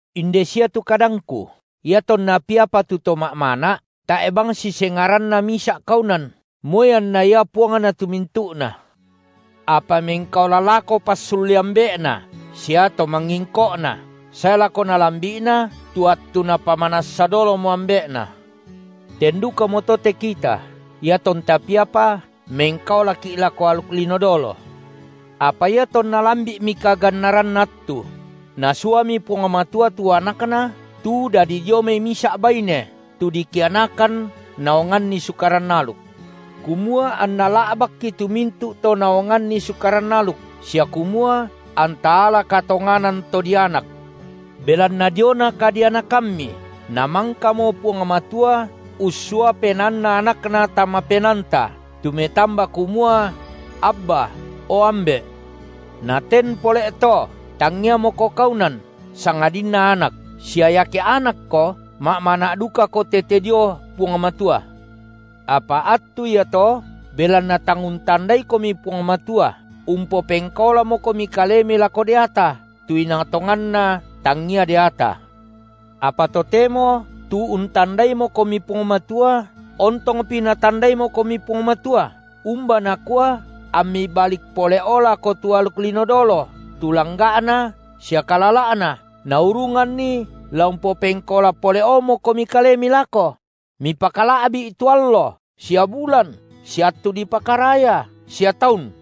Inde sia tu kadangku: iatonna piapa tu to ma’mana’, tae’ bang sisengaranna misa’ kaunan, moi anna ia puangna tu mintu’na. Apa mengkaola lako passulle ambe’na sia to mangingko’na, sae lako nalambi’na tu attu napamanassa dolomo ambe’na. Ten dukamoto te kita, iatonta piapa, mengkaolaki’ lako aluk lino dolo. Apa iatonna lambi’mi kagannaranna attu, Nasuami Puang Matua tu AnakNa tu dadi dio mai misa’ baine, tu dikianakan naonganni Sukaran aluk. Kumua anNa la’bakki tu mintu’ to naonganni Sukaran aluk, sia kumua anta ala katonganan to dianak. Belanna diona kadianakammi Namangkamo Puang Matua ussua PenaanNa AnakNa tama penaanta tu metamba kumua: Abba, o Ambe’. Naten pole’to, tangiamoko kaunan, sangadinna anak, sia iake anakko, ma’mana’ dukako tete dio Puang Matua. Apa attu iato, belanna tang untandaikomi Puang Matua, umpopengkaolamokomi kalemi lako deata, tu inang tonganna tangia deata. Apa totemo, tu untandaimokomi Puang Matua, ontongpi Natandaimokomi Puang Matua, umba nakua ammi balik pole’o lako tu aluk lino dolo, tu langga’na sia kalala’na, naurunganni la umpopengkaola pole’omokomi kalemi lako? Mipakala’bi’ tu allo sia bulan sia attu dipakaraya sia taun.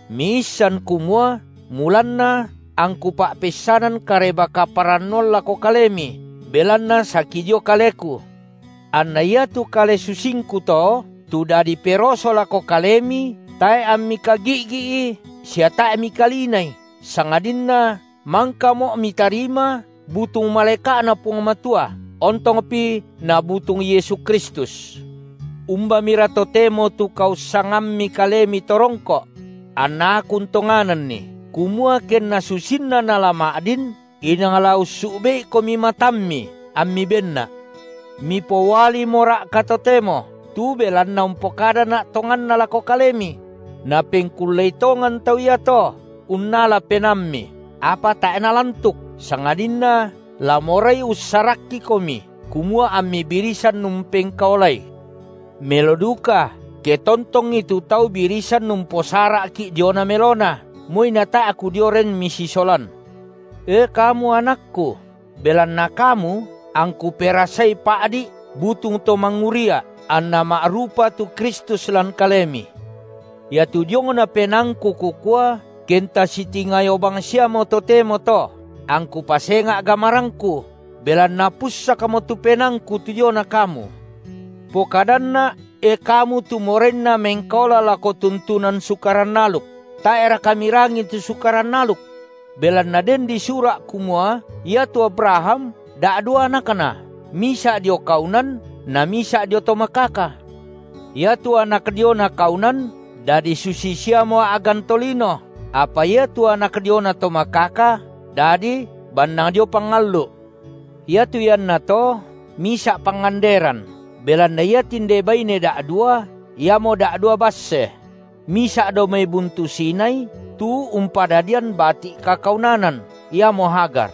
Miissan kumua mulanna angku pa’peissanan Kareba-kaparannuan lako kalemi belanna saki dio kaleku. Anna iatu kale susingku to, tu dadi peroso lako kalemi, tae’ ammi kagi’gi’i sia tae’ mikalinai, sangadinna mangkamo’ mitarima butung malaeka’Na Puang Matua, ontongpi Nabutung Yesu Kristus. Umbamira totemo tu kaussangammi kalemi to rongko’? Anna aku untonganni, kumua kenna susinna nala ma’din, inang la ussu’be’ikomi matammi ammi benna’. Mipoualimora’ka totemo, tu belanna umpokadana’ tonganna lako kalemi? Napengkullei tongan tau iato unnala penaammi, apa tae’ nalantuk, sangadinna la morai ussarakkikomi, kumua ammi birisan umpengkaolai. Melo duka, ke tontongi tu tau birisan umposara’ki’ diona melona, moi natae’ kudio ren misisolan. E kamu anakku, belanna kamu angku perasai pa’di’ butung to mangurria’, anna ma’rupa tu Kristus lan kalemi. Iatu diongna penaangku kukua, kenta sitingayo bangsiamo totemo to, angku pasenga’ gamarangku, belanna pussakmo tu penaangku tu diona kamu. Pokadanna’, e kamu tu morainna mengkaola lako tuntunan Sukaran aluk, tae’raka mirangii tu Sukaran aluk? Belanna den disura’ kumua iatu Abraham da’dua anakna, misa’ dio kaunan na misa’ dio to makaka. Iatu anak diona kaunan dadi susi siamo a’gan tolino, apa iatu anak diona to makaka dadi bannang dio pangallu’. Iatu iannato misa’ panganderan, belanna iatinde baine da’dua iamo da’dua basse: misa’ dao mai buntu Sinai, tu umpadadian bati’ kakaunanan, iamo Hagar.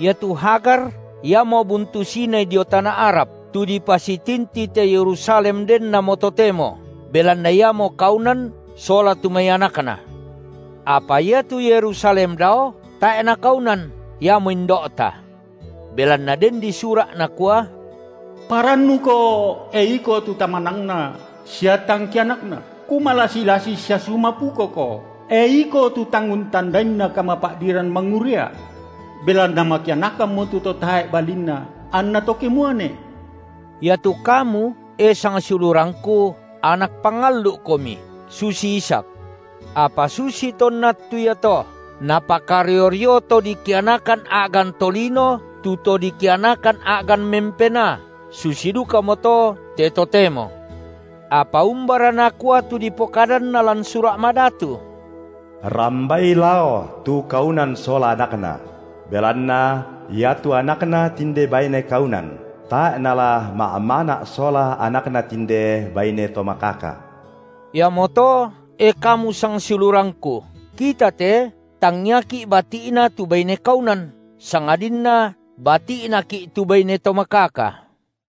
Iatu Hagar iamo buntu Sinai dio tana Arab, tu dipasitinti te Yerusalem dennamo totemo, belanna iamo kaunan sola tu mai anakna. Apa iatu Yerusalem dao, tae’ nakaunan, iamo indo’ta. Belanna den disura’, nakua: Parannuko, e iko tu tamanangna sia tang kianakna, kumalasi-lasi sia sumapukoko, e iko tu tang untandainna kamapa’diran mangurria’. Belanna makianakammo tu to tae’ balinna anna to kemuane. Iatu kamu e sangsiulurangku, anak pangallu’komi, susi Ishak. Apa susi tonna attu iato napakario-rio to dikianakan a’gan tolino tu to dikianakan a’gan mempenaa, susi dukamoto te totemo. Apa umbara nakua tu dipokadanna lan Sura’ Madatu? Rambai lao tu kaunan sola anakna, belanna iatu anakna tinde baine kaunan tae’ nala ma’mana’ sola anakna tinde baine to makaka. Iamoto e kamu sangsiulurangku, kita te tangiaki’ bati’na tu baine kaunan, sangadinna bati’naki’ tu baine to makaka.